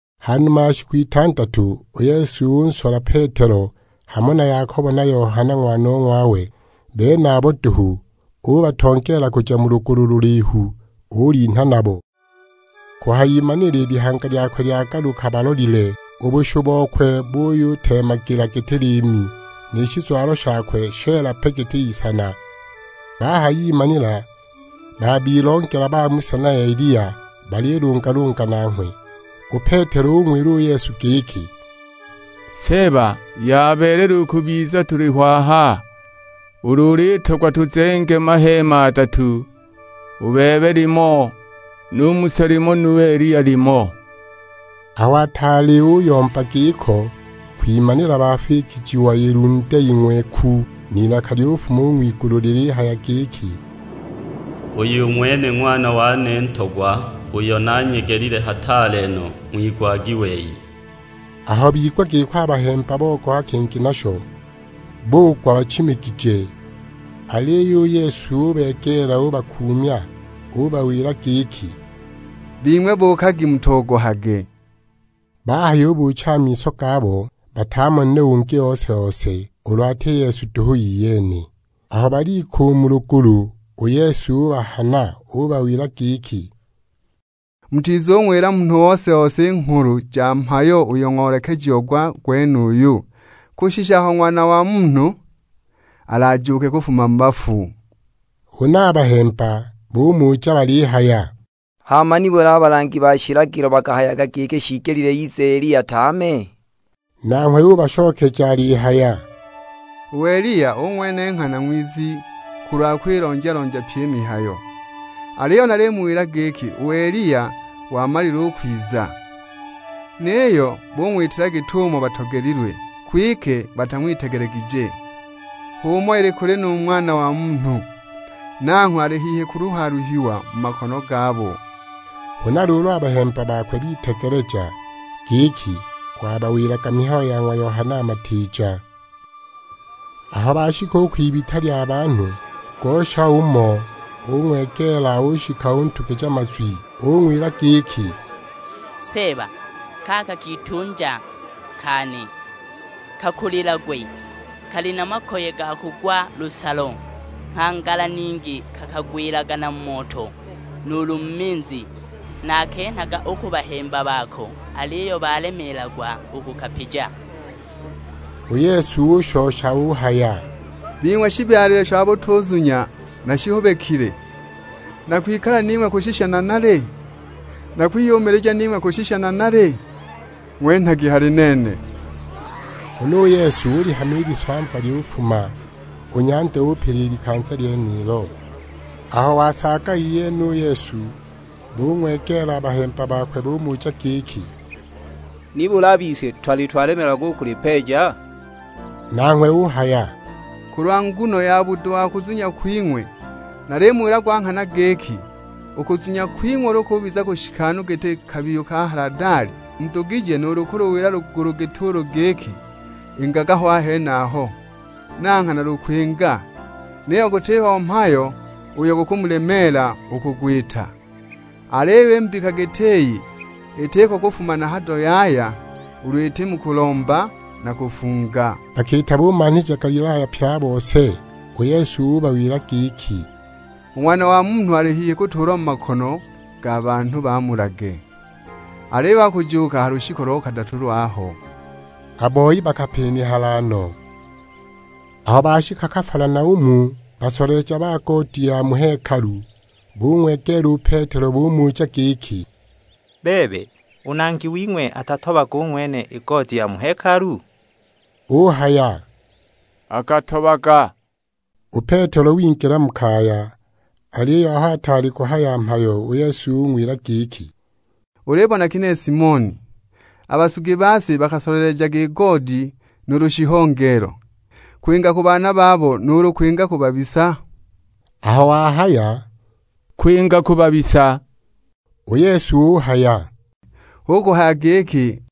Ha numa ya shiku itandatu, u Yesu unsola u Petelo, hamo na Yakobo na Yohana ng'wanong'wawe; benabo duhu. Ubatongeela kuja mu lugulu lulihu, ulinha nabo. Kuhayimanila i lihanga lyakwe lyagaluka balolile; u bushu bokwe buyuteemagila giti liimi, ni shizwalo shakwe sheela pe giti isana. Bahayimanila babilongela ba Musa na Eliya, balilungalunga nanghwe. U Petelo ung'wila u Yesu giki, "Seeba yabeelela u kubiza tuliho aha; ulu ulitogwa tuzenge maheema adatu, u bebe limo, nu Musa limo nu Eliya limo!" Aho ataali uyomba giko, kwimanila bafikijiwa ilunde ing'weku, n'ilaka lyufuma u ng'wilunde lilihaya giki, "Uyu ng'wene Ng'wana wane Ntogwa uyo nanyegelile hataale no, ng'wigwagi wei." Aho bigwa giko a bahemba bogoha kingi nasho, bugwa bachimigije. Aliyo u Yesu ubegeela ubakuumya, ubawila giki, "Bing'we buukagi mutogohage." Bahayubuucha a miso gabo, batamonile ungi ose-ose, ulu ati Yesu duhu iyene. Aho balika u mu lugulu u Yesu ubahana, ubawila giki, "Mutizung'wila munhu ose-ose i nghulu ja mhayo uyo ng'oolekejiwa gwenuyu, kushisha aho Ng'wana wa Munhu alajuuke kufuma mu bafu." Huna a bahemba bumuja balihaya; "Hama nibuli a balangi ba shilagilo bakahayaga giki shiigelile ize Eliya tame?" Nanghwe ubashokeja alihaya, "U Eliya u ng'wene nghana ng'wizi kulwa kwilonja-lonja pyi i mihayo. Aliyo nalimuwila giki u Eliya wamalile u kwiza, niyo bung'witila git'umo batogelilwe, kwike batang'witegelegije. H'umo ili nu kuli Ng'wana wa Munhu, nanghwe ali hihi kuluha-luhiwa mu makono gabo." Huna luulu a bahemba bitegeleja, giki wabawilaga mihayo ya ng'wa Yohana Matiija. Aho bashika u kwibita lya banhu, ngosha umo ung'wegeela, ushika untugija mazwi. Ung'wila giki, "Seeba kaka kitunja kane kakulilagwe, kali na makoye ga kugwa lusalo; nghangala ningi kakagwila na mu moto, nuulu mu minzi! Nakenhaga u ku bahemba bako, aliyo balemeelagwa u kukapija." U Yesu ushosha uhaya, "Bing'we shibyalilwe sha butuzunya na shihubikile, nakwikala ning'we kushisha nanali? Nakwiyumilija ning'we kushisha nanali? Ng'wenhagi hali nene." Huna u Yesu ulihama i lisamva lyufuma, u nyanda upila i likanza lyenilo. Aho wasaaga iyene u Yesu, bung'wegeela a bahemba bakwe; bumuja giki, "Nibuli a bise twali twalemeelagwa u kulipeeja?" Nanghwe uhaya, "Kulwa nguno ya budo wa kuzunya kwing'we. Nalimuwila gwa nghana giki, u kuzunya kwing'we ulu kubiza kushikanu giti kabiyu ka haladali, mudugije nuulu kuluwila lugulu git'ulu giki, 'Ingaga ho a henaho'; na nghana lukwinga. Niyo gutiho mhayo uyo gukumulemeela u kugwita. [ Aliyo i mbika giti iyi, itiko kufuma na hado yaya, ulu iti mu kulomba na kufunga.]" Bakiita bumanhija Galilaya pye a bose, u Yesu ubawila giki, "U Ng'wana wa Munhu ali hihi kutuulwa mu makono ga banhu bamulage, aliyo akujuuka ha lushiku lo kadatu lwaho." A boi bakapinihala no! Aho bashika Kafalanaumu, basoleleja ba goodi ya mu hekalu bung'wegeela u Petelo bumuja giki, "Bebe, u Nangi wing'we, atatobaga u ng'wene i goodi ya mu hekalu?" Uhaya, "Akatobaga." U Petelo wingila mu kaya; aliyo aho ataali kuhaya mhayo, u Yesu ung'wila giki, "Ulibona ginehe Simoni, a basugi ba si bakasolelejaga i goodi nuulu i shihongeelo, kwinga ku banani? Kwinga ku baana babo, nuulu kwinga ku babisa?" Aho wahaya, "Kwinga ku babisa;" u Yesu uhaya, "Hu kuhaya giki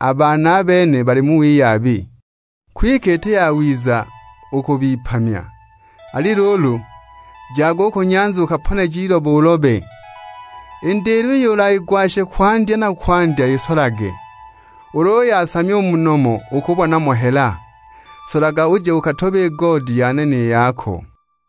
a baana a bene bali mu wiyabi. Kwike iti yawiza u kubipamya; ali luulu, jaga u ku nyanza ukaponeje ilobo ulobe, i ndilo iyo ulagwashe kwandya na kwandya isolage. Ulu uyasamya u mu nomo ukubona mo hela; solaga uje ukatobe i goodi yane ni yako."